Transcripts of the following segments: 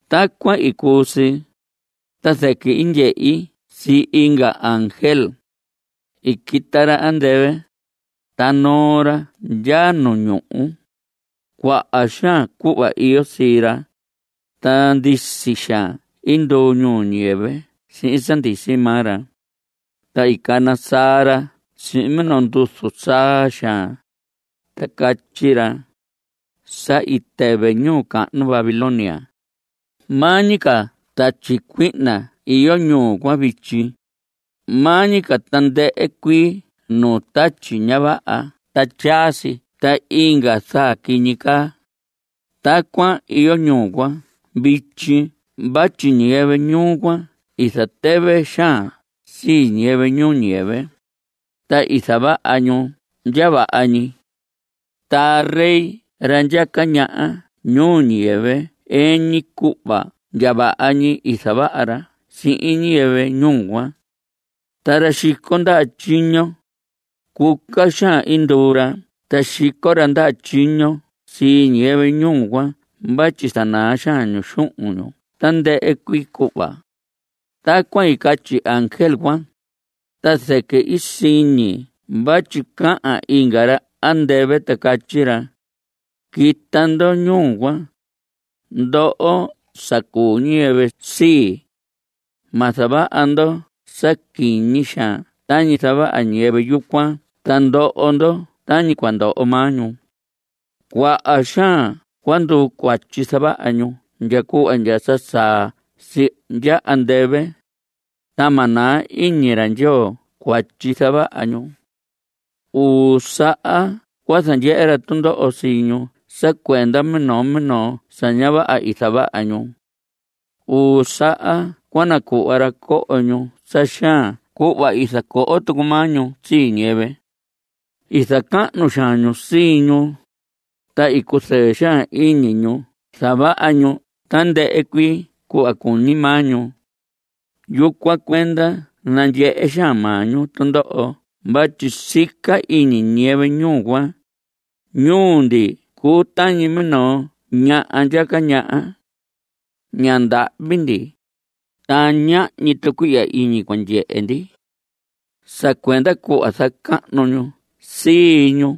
Tacuan i cuu si, ta zɨquɨ i ndyehi sii inga ángel. I quita ra andɨvɨ, ta noo ra ndya nu ñuhu. Cuaha xaan cuhva iyo sii ra, ta ndisi xaan nduu ñuu ñiyɨvɨ sihin sa ndisi maa ra. Ta i cana saa ra sihin minoo nduzu saa xaan, ta catyi ra: Sa i tɨvɨ ñuu cahnu Babilonia. Maa ñi ca tatyi cuihna iyo ñuu cuan vityi, maa ñi ca tandɨhɨ cuii nuu tatyi ña vaha ta tyasii ta inga zaa quiñi caa. Tacuan iyo ñuu cuan vityi vatyi ñiyɨvɨ ñuu cuan i zatɨvɨ xaan sii ñiyɨvɨ ñuu ñiyɨvɨ, ta i zavaha ñu ndya vaha ñi. Ra rey ra ndyaca ñaha ñuu ñiyɨvɨ ɨɨn ñi cuhva ndya vaha ñi i zavaha ra sihin ñiyɨvɨ ñuu cuan. Ta ra xico ndaha tyiño, cuca xaan nduu ra sa xico ra ndaha tyiño sii ñiyɨvɨ ñuu cuan vatyi zanaa xaan ñu xuhun ñu tandɨhɨ cuii cuhva. Tacuan i catyi ángel cuan, ta zɨquɨ i siñi vatyi cahan inga ra andɨvɨ ta catyi ra: Quita ndo ñuu cuan, ndoho sa cuu ñiyɨvɨ sii. Ma zavaha ndo sa quiñi xaan tañi zavaha ñiyɨvɨ yucuan ta ndoho ndo tañi cua ndoho maa ñu. Cuaha xaan cua nduu cuatyi zavaha ñu ndya cuhva ndya sa saa si ndya andɨvɨ, ta ma naa iñi ra Ndyoo cuatyi zavaha ñu. Uu saha cua zandyehe ra tundoho sii ñu sa cuenda minoo minoo sa ña vaha i zavaha ñu. Uu saha cua nacuhva ra coho ñu sa xaan cuhva i zacoho tucu maa ñu sii ñiyɨvɨ. I zacahnu xaan ñu sii ñu, ta i cuzɨɨ xaan iñi ñu zavaha ñu tandɨhɨ cuii cuhva cuñi maa ñu. Yucuan cuenda nandyehe xaan maa ñu tundoho vatyi sica iñi ñiyɨvɨ ñuu cuan: “Ñuu ndi cuu tañi minoo ñaha ndyaca ñaha. Ña ndahvi ndi, ta ñahñi tucuihya iñi cua ndyehe ndi.” Sa cuenda cuhva zacahnu ñu sii ñu,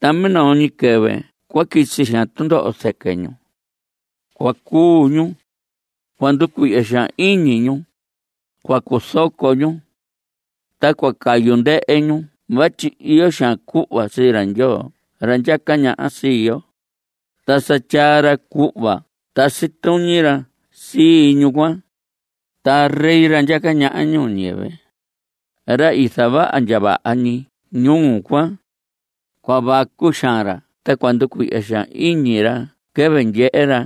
ta minoo ñi quɨvɨ cua quisi xaan tundoho zɨquɨ ñu. Cua cuu ñu; cua nducuihya xaan iñi ñu; cua cuzoco ñu. Ta cua cayu ndɨhɨ ñuu cuan vatyi iyo xaan cuhva sii ra Ndyoo ra ndyaca ñaha sii yo, ta sa tyaa ra cuhva tasi tuñi ra sii ñuu cuan. Ra rey ra ndyaca ñaha ñuu ñiyɨvɨ, ra i zavaha ndya vaha ñi ñuu cuan, cua vacu xaan ra ta cua nducuihya xaan iñi ra quɨvɨ ndyehe ra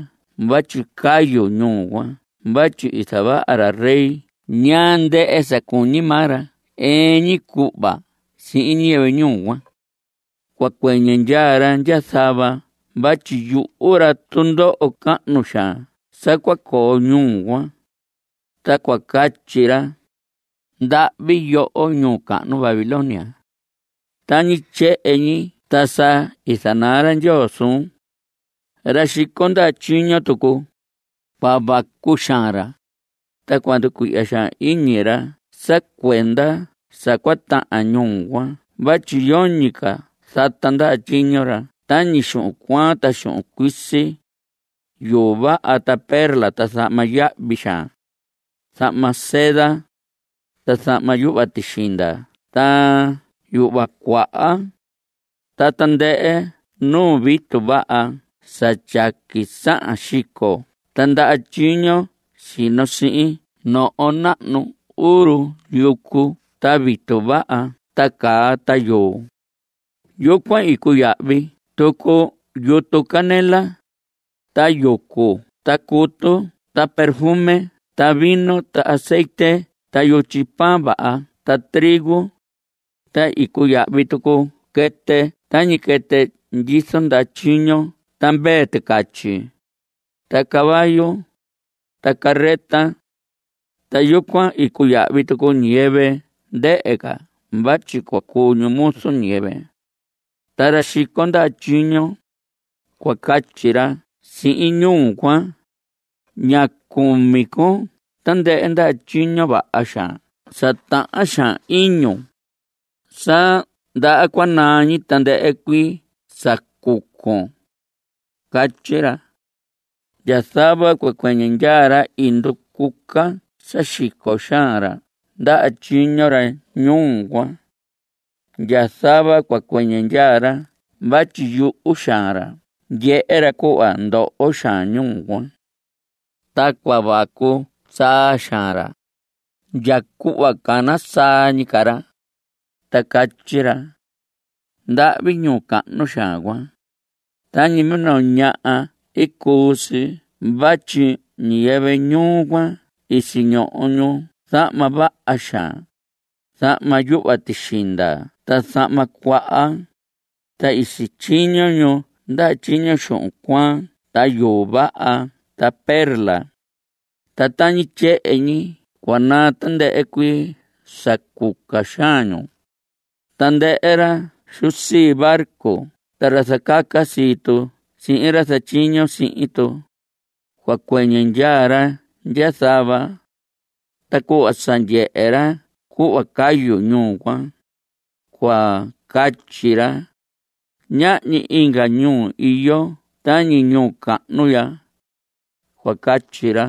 vatyi cayu ñuu cuan vatyi i zavaha ra rey cuan ñaa ndɨhɨ sa cuñi maa ra ɨɨn ñi cuhva sihin ñiyɨvɨ ñuu cuan. Cua cuɨñɨ ndyaa ra ndya zava vatyi yuhu ra tundoho cahnu xaan sa cua coo ñuu cuan, ta cua catyi ra: Ndahvi yoho ñuu cahnu Babilonia. Tañi tyehen ñi ta sa i zanaa ra Ndyoo suun. Ra xico ndaha tyiño tucu, cua vacu xaan ra, ta cua nducuihya iñi ra sa cuenda sa cua tahan ñuu cuan vatyi yoñi ca zata ndaha tyiño ra tañi xuhun cuaan, xuhun cuisi, yuu vaha, perla, zahma yahvi xaan, zahma seda, ta zahma yuhva tixinda ta yuhva cuaha, ta tandɨhɨ nuu vitu vaha sa tyaqui sahan xico ta ndaha tyiño sino sihin noho nahnu uru yucu ta vitu vaha ta caa ta yuu. Yucuan i cuyahvi tucu yutu canela, ta yucu ta cutu ta perfume ta vino ta azetye ta yutyi pan vaha ta trigo, ta i cuyahvi tucu quɨtɨ tañi quɨtɨ ndyizo ndaha tyiño ta mvee ticatyi, ta caballo, ta carreta. Ta yucuan i cuyahvi tucu ñiyɨvɨ ndɨhɨ ca vatyi cua cuu ñu muzu ñiyɨvɨ. Ta ra xico ndaha tyiño, cua catyi ra sihin ñuu cuan: ¡Ña cumi con tandɨhɨ ndaha tyiño vaha xaan sa tahan xaan iñun; sa ndaha cua naa tandɨhɨ cuii sa cucon! Catyi ra. Ndya zava cua cuɨñɨ ndyaa ra i nducuca sa xico xaan ra ndaha tyiño ra ñuu cuan. Ndya zava cua cuɨñɨ ndyaa ra vatyi yuhu xaan ra ndyehe ra cuhva ndoho xaan ñuu cuan. Ta cua vacu saa xaan ra, ndya cuhva cana saa ñi ca ra, ta catyi ra: ¡Ndahvi ñuu cahnu xaan cuan! Tañi minoo ñaha i cuu si vatyi ñiyɨvɨ ñuu cuan i siñoho ñu zahma vaha xaan, zahma yuhva tixinda ta zahma cuaha, ta i sityiño ñu ndaha tyiño xuhun cuaan ta yuu vaha ta perla. ¡Ta tañi tyehen ñi cua naa tandɨhɨ cuii sa cuca xaan ñu! Tandɨhɨ ra xu sii barco ta ra zacaca sii tu sihin ra zatyiño sihin tu, cua cuɨñɨ ndyaa ra ndya zava. Ta cuhva sa ndyehe ra cuhva cayu ñuu cuan, cua catyi ra: Ñahñi inga ñuu iyo tañi ñuu cahnu ya. Cua catyi ra.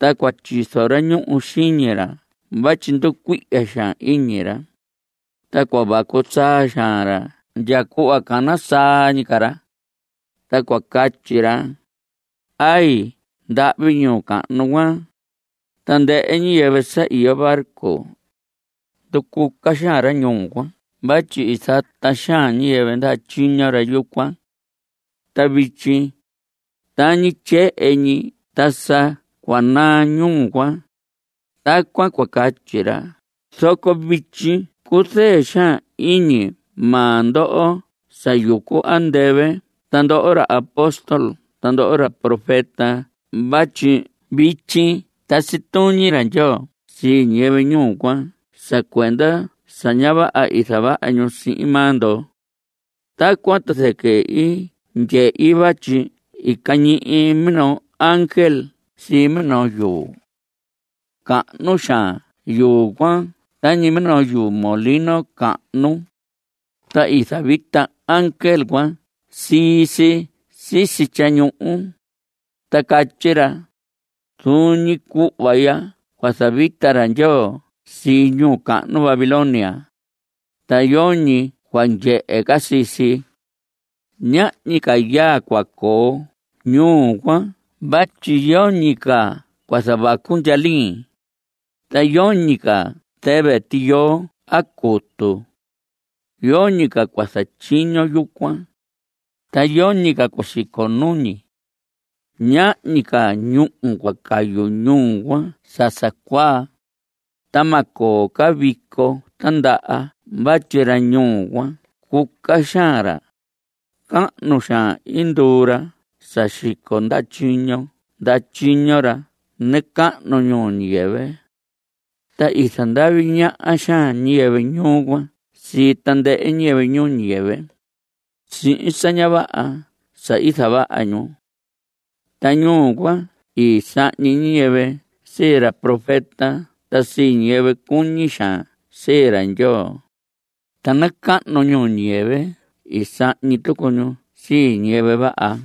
Ta cua tyizo ra ñuhu xiñi ra vatyi nducuihya xaan iñi ra, ta cua vacu saa xaan ra ndya cuhva cana saa ñi ca ra, ta cua catyi ra: ¡Ay! ¡Ndahvi ñuu cahnu cuan! Tandɨhɨ ñiyɨvɨ sa iyo barco, nducuca xaan ra ñuu cuan vatyi i zata xaan ñiyɨvɨ ndaha tyiño ra yucuan. Ta vityi, tañi tyehen ñi ta sa cua naa ñuu cuan. Tacuan cua catyi ra. Zoco vityi cuzɨɨ xaan iñi maa ndo ndoho sa yucu andɨvɨ ta ndoho ra apóstol ta ndoho ra profeta vatyi vityi tasi tuñi ra Ndyoo sii ñiyɨvɨ ñuu cuan sa cuenda sa ña vaha i zavaha ñu sihin maa ndo. Tacuan ta zɨquɨ i ndyehi vatyi i cañihi minoo ángel sii minoo yuu. Cahnu xaan yuu cuan tañi minoo yuu molino cahnu, ta i zavita ángel cuan sii si sisi tyañuhu, ta catyi ra: Zuun ñi cuhva ya cua zavita ra Ndyoo sii ñuu cahnu Babilonia. Ta yoñi cua ndyehe ca sii si. Ñahñi ca yaa cua coo ñuu cuan vatyi yoñi ca cua zavacu ndyalin, ta yoñi ca cua tɨvɨ tiyoo a cutu. Yoñi ca cua zatyiño yucuan, ta yoñi ca cua ndyico nuñi. Ñahñi ca ñúhu cua cayu ñuu cuan sa sa cuaa. Ta ma coo ca vico tindaha vatyi ra ñuu cuan cuca xaan ra, ta cahnu xaan i nduu ra sa xico ra ndaha tyiño ra nacahnu ñuu ñiyɨvɨ. Ta i zandavi ñaha xaan ñiyɨvɨ ñuu cuan sii tandɨhɨ ñiyɨvɨ ñuu ñiyɨvɨ (sihin sa ña vaha sa i zavaha ñu.) Ta ñuu cuan i sahñi ñiyɨvɨ sii ra profeta ta sii ñiyɨvɨ cuñi xaan sii ra Ndyoo, ta nacahnu ñuu ñiyɨvɨ i sahñi tucu ñu sii ñiyɨvɨ vaha.